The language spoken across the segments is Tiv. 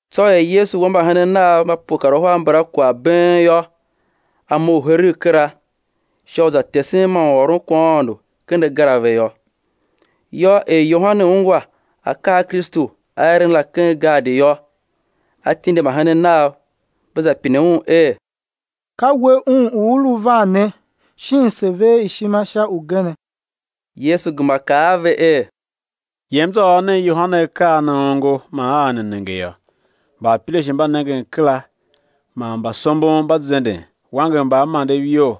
Tsô er Yesu wa mbahenen Nav mba pue kar uhar mbala kwagh been yô, A mough heregh kera, sha u za tesen man u ôron kwaghaôndo ken agar a ve yô. Yô, er Yohane ungwa akaa a Kristu A eren la ken gaadi yô, a tindi mbahenen nav ve za pine Un er: Ka We Un u U lu van ne, shin se ver ishima sha ugenee? Yesu gema kaa a ve er: Yem, za ôr nen Yohane akaa a ne ongo man a ne nenge yô; mbaapirashe mba nengen kera, man mbasombon mba zenden, wanger mbaamandev iyol,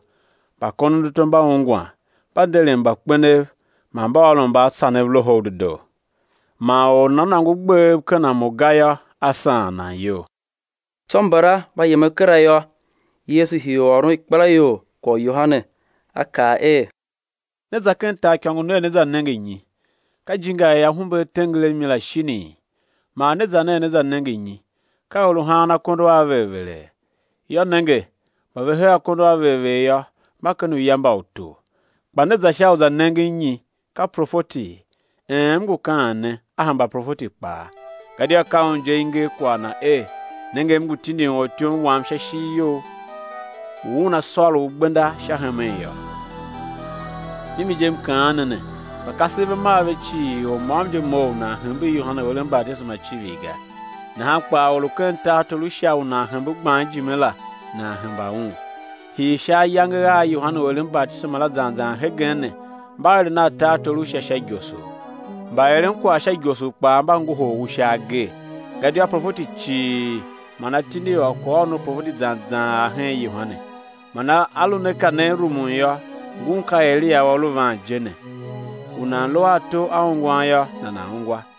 mbakondonato mba ungwan; mba nderen mbakpenev, man mba ôron mbaatsanev Loho u Dedoo. Man or u nana nôngo gbev ken a Mo ga yô, á saan nan iyol. Tsô mbala mba yemen kera yô, Yesu hii u ôron ikpelaior kwagh u Yohane, A kaa er; Ne za ken taaikôngo ner, né za nenge nyi? Ka ijinga i ahumbe a tenger a mi la shinii? Man ne za ner, né nenge nyi? Ka or u haan akondo a ver vere? Yô, nenge, mba ve hee akondo a ver ver yô, mba ken uya mba utor. Kpa ne za sha u za nengen nyi? Ka profeti? Een, M ngu kaan ne, a hemba profeti kpaa. Gadia ka un je i nger kwagh na er: Nenge, M ngu tindin ortyom Wam sha ishigh You; u una sôr U gbenda sha hemen yô. Mimi je, M kaan ne ne, mba kasev ve mar ve cii, or môm je mough u nan hembe Yohane u eren batisema icivir ga; nahan kpaa, or u ken tartor u Sha u nan hembe gban ijime la nan hemba un. Hii sha ayange a Yohane u eren batisema zan zan hegen ne, mba eren a tartor u Sha sha igosor; mbaeren kwagh sha igosor kpaa mba ngohol u sha agee. Gadia uprofeti cii man atindi ôr kwaghôron u profeti zan zan ar hen Yohane. Man a lu ne ka ne rumun yô, ngun ka Eliya u a lu van je ne. U nan lu a ato a ungwan yô, nana̱ ungwa.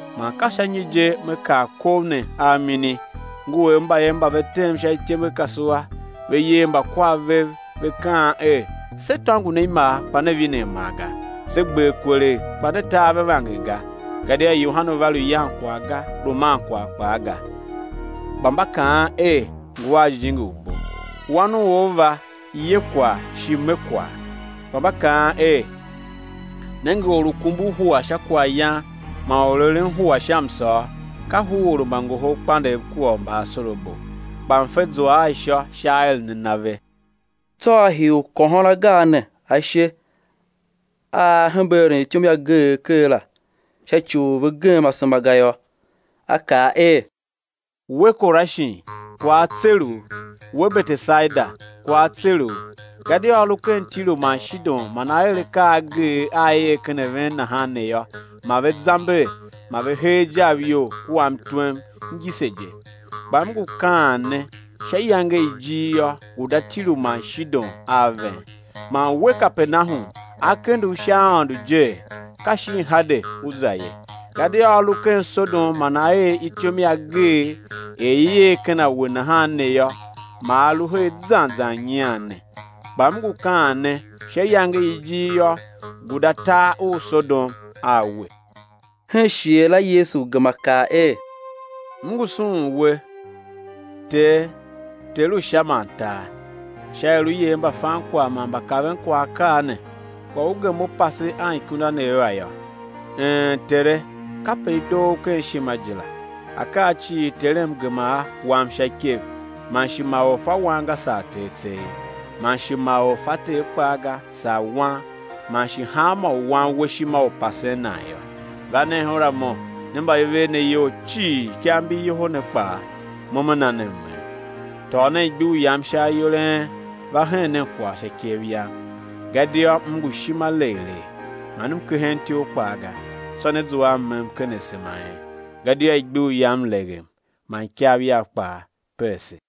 Man ka sha nyi je Me kar kov ne a mini? Ngu er mbayev mba ve tem sha ityembekasua, ve yer mbakwav vev, ve kaan er: Se tôngo ne imar, kpa ne vine amar ga; se gber kwelegh, kpa ne ta ave vanger ga. Gadia Yohane va, lu yan kwagh ga, lu man kwagh kpaa ga, kpa mba kaan er: Ngu a jijingi u bo. Wan u or va, ye kwagh shi me kwagh, kpa mba kaan er: Nenge, or u kumbur hua sha kwaghyan, man or u eren hua sha msôr, ka huror u mbangoholkpandegh kua u mbaasorabo. Kpa mfe zua a ishô sha aeren a na ve. Tsô a hii u kôhôn agar ne ashe a A hembe eren ityom i ageegh ker la, sha ci u ve gem asema ga yô. A kaa er: We Korashin, kwagh á tser u, we Betesaida, kwagh á tser u; gadia a lu ken Tiru man Shidon man a er akaa a ageegh a i er ken a ven nahan ne yô, ma ve zamber ma ve hee ajav iyol kua mtwem ngise je. Kpa M ngu kaan ne, sha iyange ijir yô, guda Tiru man Shidon a ven. Man we Kapernahum, á kende u sha aôndo jee? ka shin Hade ú za ye; gadia a lu ken Sodom man a er ityom i ageegh er i er ken a we nahan ne yô, ma a lu her zan zan nyian ne. Kpa M ngu kaan ne, sha iyange i ijir yô, guda tar u Sodom a we. Hen shighe la Yesu gema kaa er: M ngu sughun We, Tere, Ter u Sha man tar, sha er U yer mbafankwagh man mbakavenkwagh akaa ne, kpa U gem U pase anikundanev a yô. Een, Tere! Kape i doo U ken ishima je la. Akaa cii Terem gema a, wam sha ikev, man shi ma or fa Wan ga, saa Ter tseegh, man shi ma or fa Ter kpaa ga, saa Wan, man shi hanmô u Wan A we ishima u pasen nan yô. Va nen her a Mo, ne mba i ver ne iyol cii, ikav mbi yoho ne kpaa, Mo me na ne mmem. Tôô nen igbur Yam sha ayol a en, va hen nen kwagh sha ikev Yam, gadia M ngu ishima legh legh, man M kehen ityough kpaa ga, tsô né zua a mmem ken asema a en; gadia igbur Yam leghem man ikav Yav kpaa peese.